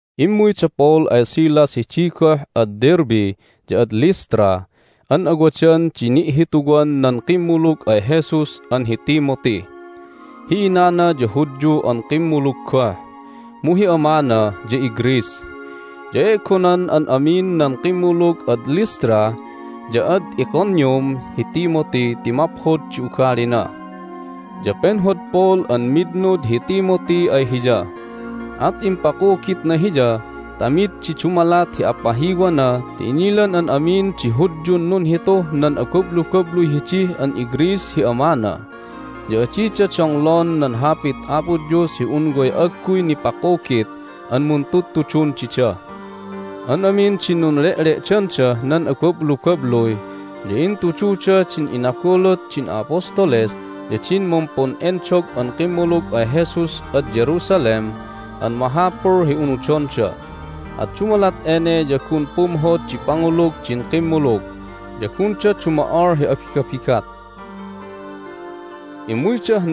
Immuy da Paul ay Silas hidi goh ad Derbe ya ad Lystra an awadan di ni'hituwan nan kimmulug ay Jesus an hi Timothy. Hi inana ya Hudyu an kimmulug goh, mu hi amana ya iGreece. Ya e'gonan an amin nan kimmulug ad Lystra ya ad Iconium hi Timothy ti maphod di ugalina. Ya penhod Paul an mitnud hi Timothy ay hiya, at impakugitna hiya ta mid di dumalat hi apahiwana ti inilan an amin di Hudyun nunhituh nan abablubabluy hidi an iGreece hi amana, ya adida donglon nan Hapit Apo Dios hi un way agguy nipakugit an muntudtudun dida. An amin din nunle'le'dandah nan abablubabluy ya intududa din inabulut din a'apostoles ya din mumpun'endog an kimmulug ay Jesus ad Jerusalem an mahapul hi unudonda. At dumalat ene ya gun pumhod di pangulug din kimmulug, ya gunda dumo'ol hi abigabigat. Hay Inayan da Paul ad Troas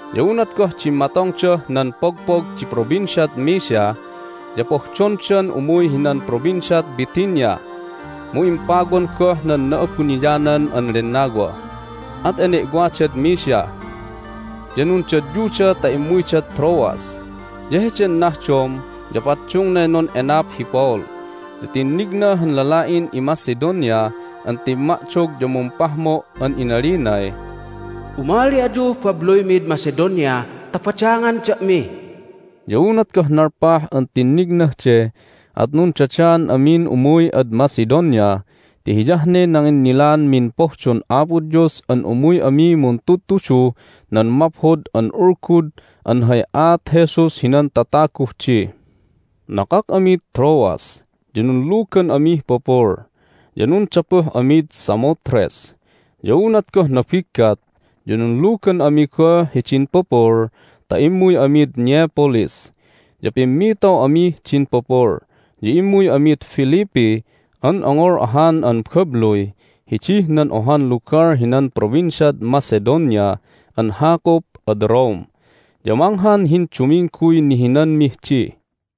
Ya unat goh dimmatongdah nan pogpog di Provinciad Mysia ya pohdondan umuy hinan Provinciad Bithynia, mu impawan goh nan Na'abuniyanan an Lennawa. At ene'wadad Mysia, ya nundadyuda ta immuydad Troas. Ya heden nahdom ya paddungnay nun'enap hi Paul, ya tinnigna han lala'in iMacedonia an timma'dog ya mumpahmo' an inalinay, "Umali ayuh babluymid Macedonia ta badangan da'mi!" Ya unat goh nalpah an tinnignah de at nundadaan amin umuy ad Macedonia ti hiyah ne nanginnilaanmin pohdon Apo Dios an umuy ami muntudtuduh nan Maphod an Ulgud an hay aat Jesus hinan tataguh di. Hay Inayan da Paul ad Philippi Nakak amid Troas, ya nunlugan amih pupul, ya nundapuh amid Samothrace. Ya unat goh nabiggat ya nunlugan ami goh hidin pupul ta immuy amid Neapolis. Ya pimmitaw amih din pupul, ya immuy amid Philippi an ongol ahan an babluy hidih nan ohan lugal hinan Provinciad Macedonia an hakup ad Rome. Ya manghan hindumingguy nihinanmih di.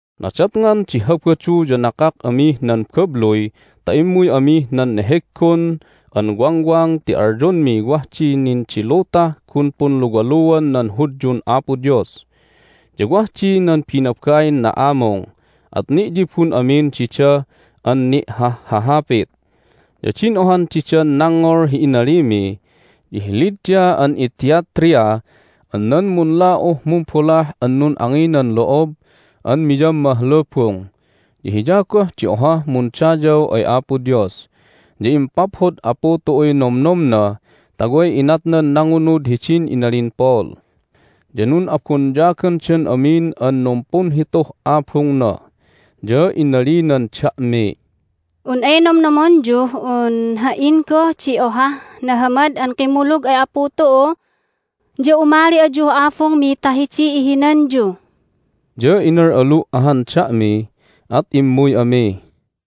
Nadatngan di Habadu ya nakak amih nan babluy ta immuy amih nan neheggon an wangwang ti alyonmiy wah di nin di lutah gun punluwaluan nan Hudyun Apo Dios. Ya wah di nan binabain na'amung, at ni'yibun amin dida an ni'hahhahapit. Ya din ohan didan nangngol hi inalimi ya hi Lydia an iThyatria an nan munla'uh mumbolah an nun'anginan lo'ob an miyammah lubung, ya hiya goh di ohah mundayaw ay Apo Dios. Ya impaphod Apu tu'uy nomnomna ta way inatnan nangunud hidin inalin Paul. Ya nun'abonyagandan amin an numpunhituh abungna. Ya inalinan da'miy, "Un ay nomnomonyuh un ha"in goh di ohah nahamad an kimmulug ay Apu tu'u ya umali ayuh abungmi ta hidiy ihinanyu." Ya inal'alu' ahan da'mi, at immuy ami.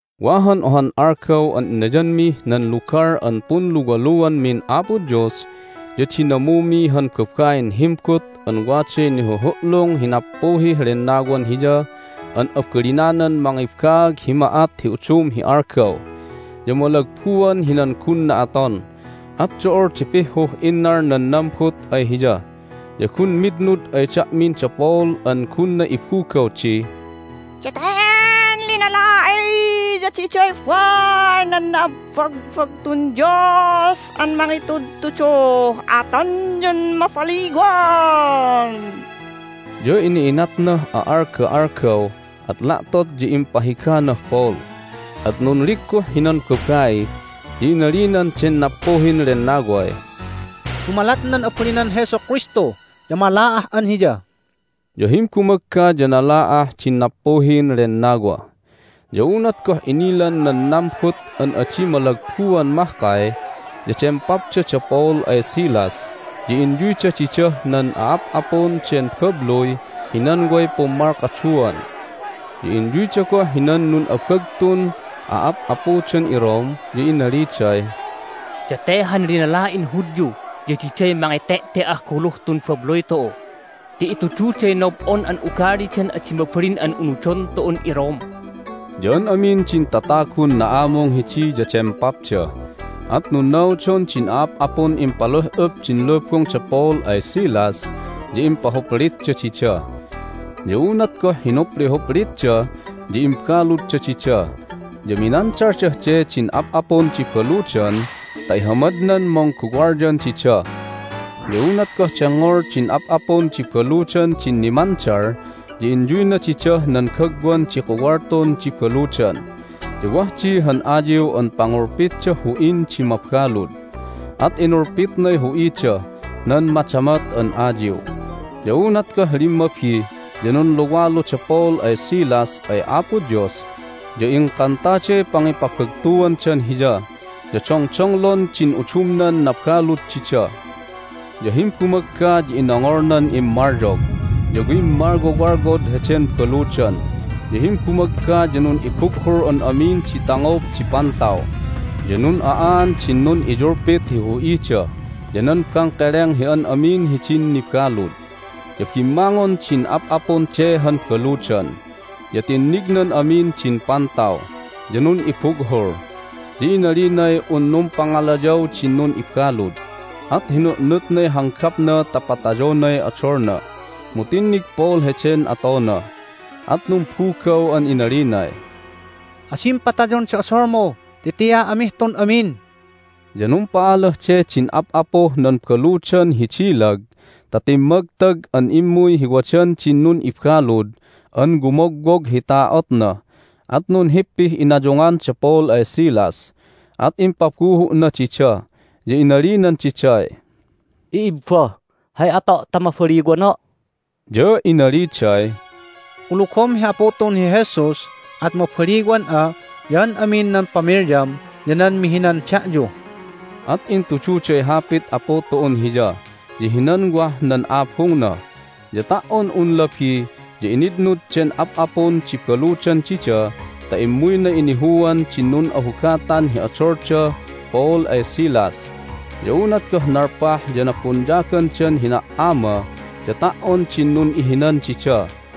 Wa han ohan algaw an inayanmih nan lugal an punluwaluanmin Apo Dois ya dinamumi han babain himbut an waday nihuhu'lung hi nappuhih lennawan hiya an abalinanan mangibaag hi ma'at hi udum hi algaw. Ya malagbuan hinan gunna aton, at do'ol di pihhuh innal nan nambut ay hiya. Ya gun mitnud ay da'min da Paul an gunna ibugaw di, "Daten linala'i ya diday baal nan na'abbagbagtun Dios an mangitudtuduh atonyun mabaliwan!" Ya ina'inatnah a'alga'algaw, at la'tot ya impahiganah Paul, at nunligguh hinan babai, ya inalinan den nappuhin lennaway, "Dumalat nan abalinan Jesu Kristu ya mala'ah'an hiya!" Ya himbumagga ya nala'ah din nappuhin lennawa. Ya unat goh inilan nan nambut an adi malagbuan mahkay ya dempapda da Paul ay Silas, ya inyuyda didah nan a'ap'apun den babluy hinan way pummalkaduan. Ya inyuyda goh hinan nun'abagtun a'ap'apudan iRome, ya inaliday, "Date han linala'in Hudyu ya diday mangete'te"ah guluh tun babluy tu'u ti itududay nob'on an ugalidan adi mabalin an unudon tu'un iRome!" Ya an amin din tatagun na'amung hidi ya dempapda, at nunnaudon din a'ap'apun impaluh'up din lubung da Paul ay Silas, ya impahuplitda dida. Ya unat goh hinuplihuplitda ya imbaludda dida, ya minandaldah de din ap'apun di baludan ta ihamadnan mungguwalyan dida. Ya unat goh dengngol din ap'apun di baludan din nimandal ya inyuyna didah nan gagwan di kuwaltun di baludan, ya wah di han ayiw an pangulpitdah hu'in di mabalud, at inulpitnay hu'idah nan madamot an ayiw. Ya unat goh limmabi ya nunluwalu da Paul ay Silas ay Apo Dios, ya ingkantaday pangipabagtuandan Hiya. Ya dongdonglon din udumnan nabalud dida. Ya himbumagga ya inongolnan immalyog, ya wimmalwowalwod heden baludan. Ya himbumagga ya nun'ibughul an amin di tangob di pantaw, ya nun'a'aan din nun'iyulpit hi hu'ida ya nan bangkeleng hi an amin hidin nibalud. Ya bimmangon din ap'apun de han baludan, ya tinnignan amin din pantaw, ya nun'ibughul. Ya inalinay un numpangalayaw din nun'ibalud, at hinu'nutnay hanggapna ta patayonay odolna. Mu tinnig Paul heden atona, at numbugaw an inalinay, "Adim patayon di odolmu, ti tia amih tun amin!" Ya numpa'alah de din ap'apuh nan baludan hi dilag ta timmagtag an immuy hi wadan din nun'ibalud an wumogwog hi ta'otna, at nunhippih inayungan da Paul ay Silas. At impabuhu'na dida, ya inalinan diday, "I'ibba! Hay ato' ta mabaliwana'?" Ya inaliday, "Kulugom hi Apu tu'un hi Jesus, at mabaliwan'a, ya an amin nan pamilyam, ya nan mihinan da'yu." At intududay Hapit Apu tu'un hiya ya hinan wah nan abungna. Ya ta"on un labi ya initnud den ap'apun di baludan dida ta immuyna inihuan din nun'ahugatan hi odol da Paul ay Silas. Ya unat goh nalpah ya nabonyagandan hina"ama ya ta"on din nun'ihinan dida.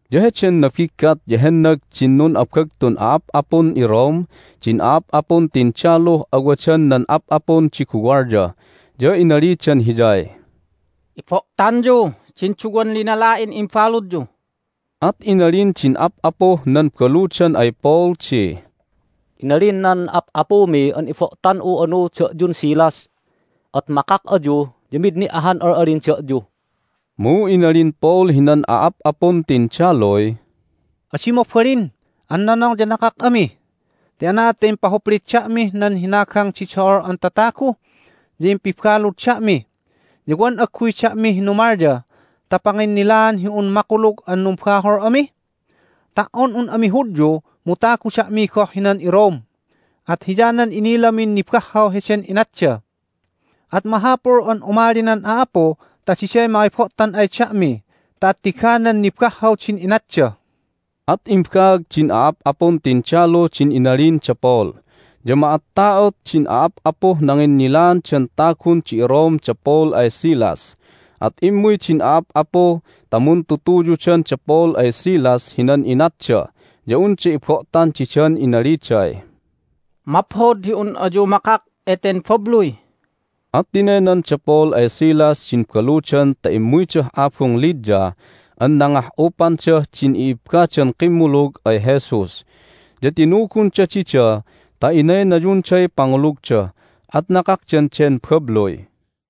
Ya heden nabiggat ya hennag din nun'abagtun a'ap'apun iRome din a'ap'apun tindaluh awadan nan ap'apun di guwalya, ya inalidan hiyay, "Ibo'tanyu din duwan linala'in imbaludyu." At inalin din ap'apuh nan baludan ay Paul di, "Inalin nan ap'apumi an ibo'tan'u anu da'yun Silas. At makak ayu, ya mid ni' ahan al'alin da'yu." Mu inalin Paul hinan a'ap'apun tindaluy, "Adi mabalin an nonong ya nakak ami, ti anaad ta impahuplit da'mih nan hinagang di do'ol an tatagu, ya impibalud da'mi, ya wan agguy da'mi hinumalya ta panginnilaan hi un makulug an numbahol ami? Ta"on un ami Hudyu mu tagu da'mi goh hinan iRome, at hiyanan inilamin nibahhaw heden inatda! At mahapul an umali nan a'apu ta diday mangibo'tan ay da'mi ta attiganan nibahhaw din inatda!" At imbaag din a'ap'apun tindalu din inalin da Paul, ya ma'atta'ot din a'ap'apuh nanginnilaandan tagun di Rome da Paul ay Silas. At immuy din a'ap'apu ta muntutuyudan da Paul ay Silas hinan inatda ya unda ibo'tan didan inaliday, "Maphod hi un ayu makak eten babluy!" At tinaynan da Paul ay Silas din baludan ta immuydah abung Lydia an nangah'upandah din i'ibbadan kimmulug ay Jesus. Ya tinugunda dida ta inaynayunday pangulugda. At nakakdan den babluy.